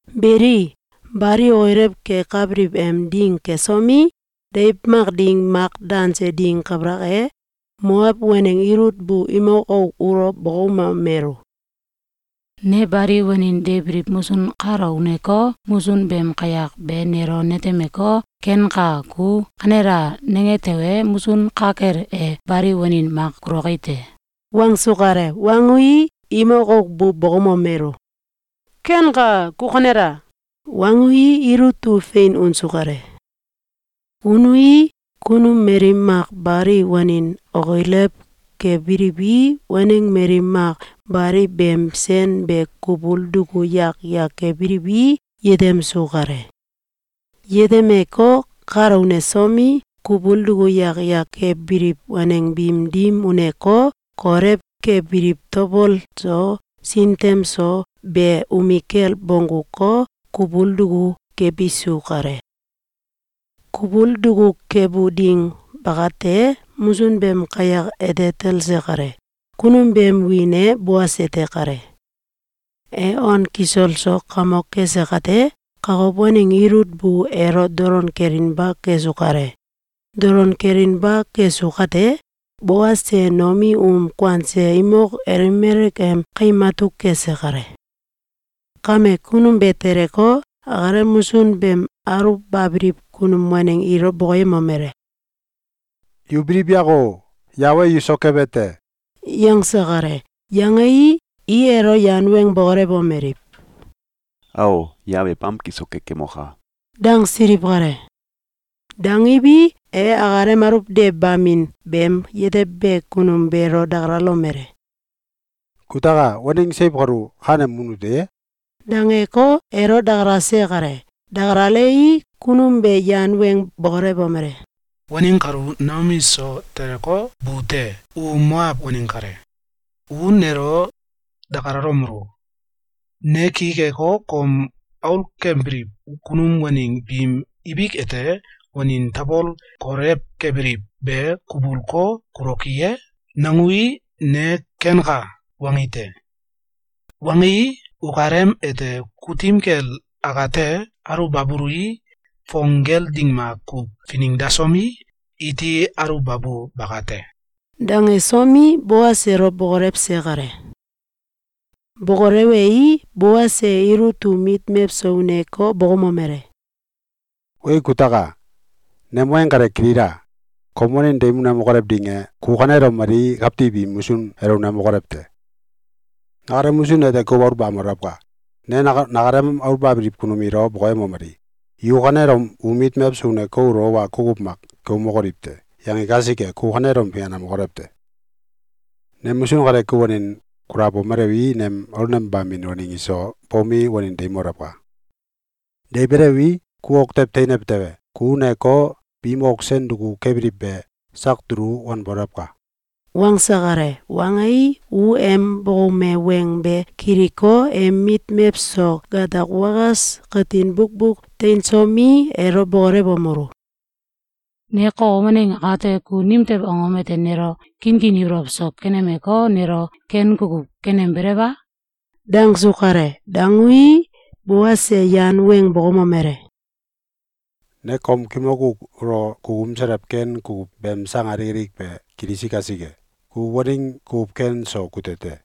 Beli, Bali okilew kekabiliw em ding kesomi, deiw mak ding mak danse ding kabalak e, Moaw waneng Ilut bu imok auk ulo bokoumomelu: “Ne bali wanin deibiliw musun kalo uneko, musun beem kayak be nelo netemeko, ‘Kenka! Ku kanela!’, nange tewe, musun ka kel e bali wanin mak kuloki te.”, wangsu kale. Wangui, imok auk bu bokoumomelu: “Kenka. Ku kanela!”, wangui, Ilut u fein unsu kale. Unui, kunum mali mak bali wanin okilew kebiliwi, waneng mali mak bali beem sen be kubul duku yak yak kebiliwi, yetemsu kale. Yetemeko, kalo unesomi, kubul duku yak yak kebiliw waneng biim dim uneko, kolew kebiliw tabol so sintem so be umikel bongguko, kubul duku kebisu kale. Kubul duku kebu dim bakate, musun beem kayak ete talse kale. Kunum beem wiin e Boas ete kale. E on kisol so kamok kese kate, kokow waneng Ilut bu elo dolon kelinba kesu kale. Dolon kelinba kesu kate, Boas e Noomi um kuanse imok Elimelek em kaim atuk kese kale. Kame, kunum be teleko, akalem musun aluwbabiliw kunum waneng biilo bokoyemomele: “Yu biliw yako! Yawe e yu so kebe te!” yangse kale. Yangei, i elo yan weng bokolewomeliw: “Ao! Yawe e bamki so kekemoka!” dangsiliw kale. Dangiwi, e akalem aluwdewbamin beem yetebe kunum beelo dakalalomele: “Kutaka! Waneng seiw kalu kanem mun ute ye?”, dangeko, elo dakalase kale. Dakalalei, kunum be yan weng bokolewomele: “Waneng kalu Noomi so teleko, bu te. U Moaw waneng kale. U nelo dakalalomelu: ‘Ne ki keko, kom aulkembiliw kunum waneng biim ibik ete wanin tabol kolew kebiliw be kubulko, kuloki ye?’, nangui, ne ‘Kenka!’, wangi te. Wangii, ukalem ete kutim kel akate aluwbabului, fong gel ding makuw finengdasomi, iti aluwbabu bakate!”, dangesomi, Boas elo bokolewse kale. Bokolewei, Boas e Ilut um mit mewso uneko, bokoumomele: “Weya kutaka! Nem weng kale kilila! Kom wanin deimokolew ding dim bakate, ku kanelom mali kawtiw im musun elo unemokolew te! Nakalem musun ete kuw aluwbamolewka! Ne nakalem aulnembabiliw kunum ilo bokoyemomeli: ‘Yu kanelom um mit mewso uneko, ulo wa kukuw mak keumbokoliw te!’, yangi kasike, ku kanelom finganemokolew te! Nem musun kale kel wanin kulabomelewi, nem aulnembamin waneng iso bomi, wanin deimolewka! Deibelewi, ku ok tew teinew tewe, ku uneko, biim ok sen duku kebiliw be, sak dulu wanbolewka!”, wangse kale. Wangei, u em bokoume weng be kiliko, em mit mewso gatak wakas katin bukbuk teinsomi, elo bokolewomelu: “Ne kokow waneng akate, ku nimtew angom ete nelo kinkin ibolow so kenemeko, nelo ken kukuw kenembelew a?” dangsu kale. Dangui, Boas e yan weng bokoumomele: “Ne kom kimok auk ulo kukuumselew ken kukuw beem sang alik be kilisi kasike. Ku waneng kukuw ken so kute te.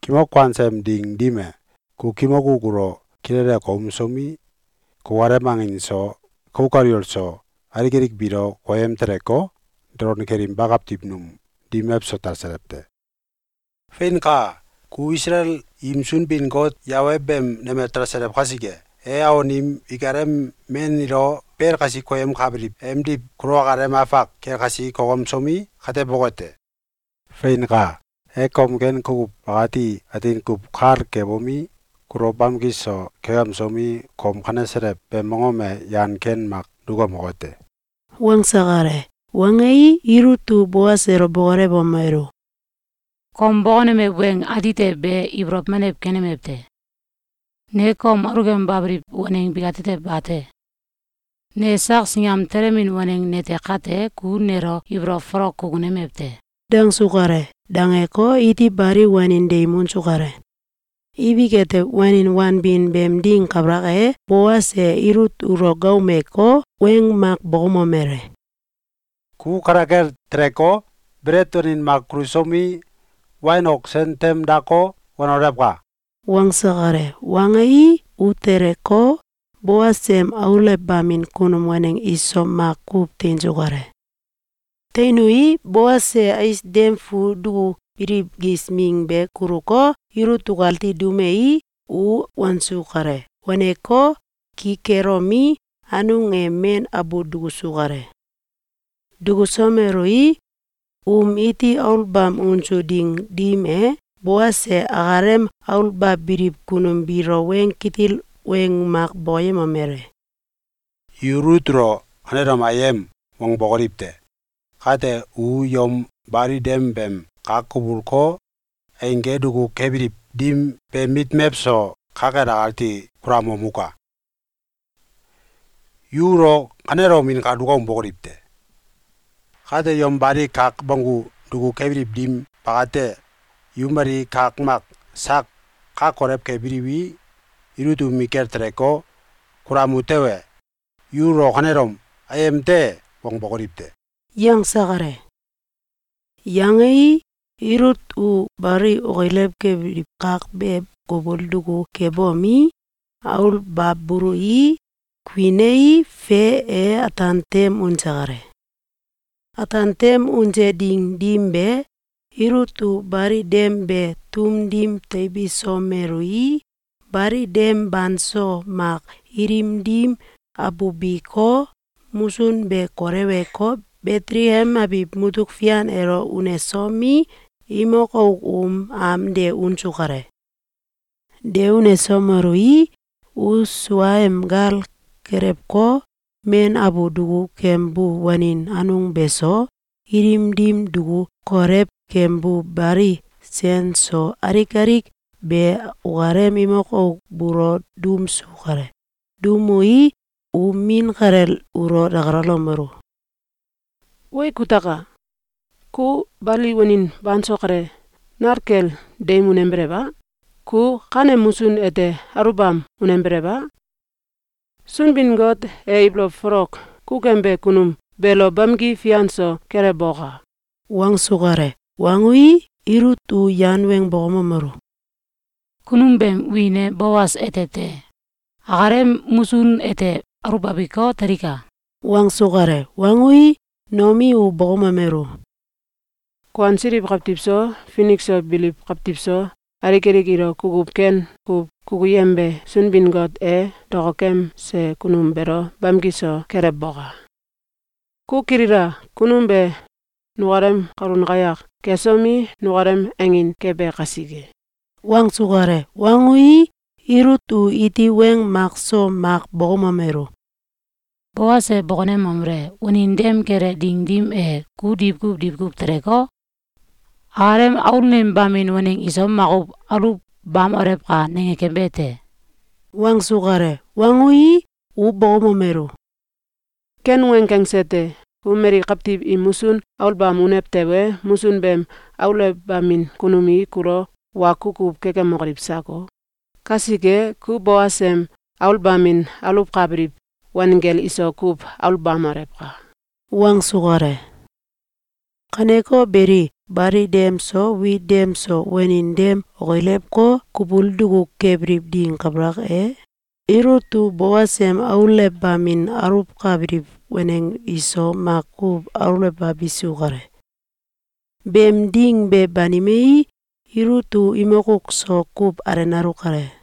Kimok kuanse em ding dim e, ku kimok auk ulo kilele keumsomi, kukalem aneng so, kauk kaliwol so, alik alik biilo koyem teleko, dolon kelinba kawtiw num dim mewso talselew te. Feinka! Ku Isalael im Sunbin-Got Yawe beem nemel talselew kasike, e awon im ikalem men ilo bel kasi koyemkabiliw emdiw kulo akalem afak kel kasi kokemsomi, kateboke te. Feinka! E kom ken kukuw bakati atin kuw kal kebomi, kulo bamki so kekemsomi, kom kaneselew beem mongom ete yan ken mak dukemoke te.”, wangse kale. Wangei, Ilut u Boas elo bokolewomelu: “Kom bokonemew weng atite be ibolow menew keneme te. Ne kom aulkembabiliw waneng bikatetew bate! Ne sak singam telemin waneng nete kate, ku nelo ibolow folok kukunemew te.”, dangsu kale. Dangeko, iti bali wanin deim unsu kale. Ibik ete, wanin wanbin beem ding kabalak e, Boas e Ilut ulo gaaumeko, weng mak bokoumomele: “Ku kale kel teleko, belet wanin mak kulusomi, wain ok sen tem dako, wanolewka!”, wangse kale. Wangei, u teleko, Boas em aulewbamin kunum waneng iso makuw teinsu kale. Teinui, Boas e ais dem fu dukubiliw gis ming be kuluko, Ilut ukati duumei, u wansu kale. Waneko, ki kelomi, anung e men abu dukusu kale. Dukusomelui, um iti aluwbam unsu ding dim e, Boas e akalem aluwbabiliw kunum biilo weng kitil weng mak bokoyemomele: “Yu Ilut ulo kanelom ‘Ayem!’, wangbokoliw te! Kate u yom bali dem beem kak kubulko, eingge duku kebiliw dim beem mit mewso ka kel akati kulamomuka! Yu ulo kanelom inkal dukaumbokoliw te! Kate, yom bali kak bonggu duku kebiliw dim bakate, yu mali kak mak sak ka kolew kebiliwi, Ilut umikel teleko, kulamu tewe, yu ulo kanelom ‘Ayem te!’, wangbokoliw te!”, yangse kale. Yangei, Ilut u bali okilew kebiliw kak be kubul duku kebomi, aluwbabului, kuinei, fe e, ataan tem unse kale. Ataan tem unse ding dim be, Ilut u bali dem be tum dim teibisomelui, bali dem banso mak, ilim dim abubiko, musun be koleweko, Betelekem abiw mutuk fian elo unesomi, imok auk um am de unsu kale. De unesomelui, u suaem gal kelewko, men abu duku kembu wanin anung beso, ilim dim duku kolew kembu bali sen so, alik alik be ukalem imok auk buulo duumsu kale. Duumui, u min kalel ulo dakalalomelu: “Wee! Kutaka! Ku bali wanin banso kale, nal kel deim unembelew a? Ku kanem musun ete aluwbam unembelew a? Sunbin-Got e ibolow folok kukembe kunum beelo bamki fian so kelewboka!”, wangsu kale. Wangui, Ilut u yan weng bokoumomelu: “Kunum beem wiin e Boas ete te. Akalem musun ete aulbabiko, telika.”, wangsu kale. Wangui, Noomi u bokoumomelu: “Kuansiliw kawtiw so, finik so biliw kawtiw so, alik alik ilo kukuw ken kuw kukuyembe Sunbin-Got e dokokemse kunum beelo bamki so kelewboka! Ku kilila! Kunum be nukalem kalun kayak kesomi, nukalem angin kebe kasike.”, wangsu kale. Wangui, Ilut u iti weng mak so mak bokoumomelu: “Boas e bokonemomele: ‘Wanin dem kele ding dim e, ku diwkuw diwkuw teleko, akalem aulnembamin waneng iso makuw aluwbamolewka!’, nange kembe te.”, wangsu kale. Wangui, u bokoumomelu: “Ken weng kangse te. Ku mali kawtiw im musun aulbam unew tewe, musun beem aulewbamin kunum i kulo wa kukuw kekemokoliw sako! Kasike, ku Boas em aulbamin aluwkabiliw wanggel iso kuw aulbamolewka!”, wangsu kale. Kaneko beli, bali dem so wit dem so, wanin dem okilewko, kubul duku kebiliw dim kabalak e, Ilut u Boas em aulewbamin aluwkabiliw waneng iso makuw aluwbabisu kale. Beem ding be banimei, Ilut u imok auk so kuw alenalu kale.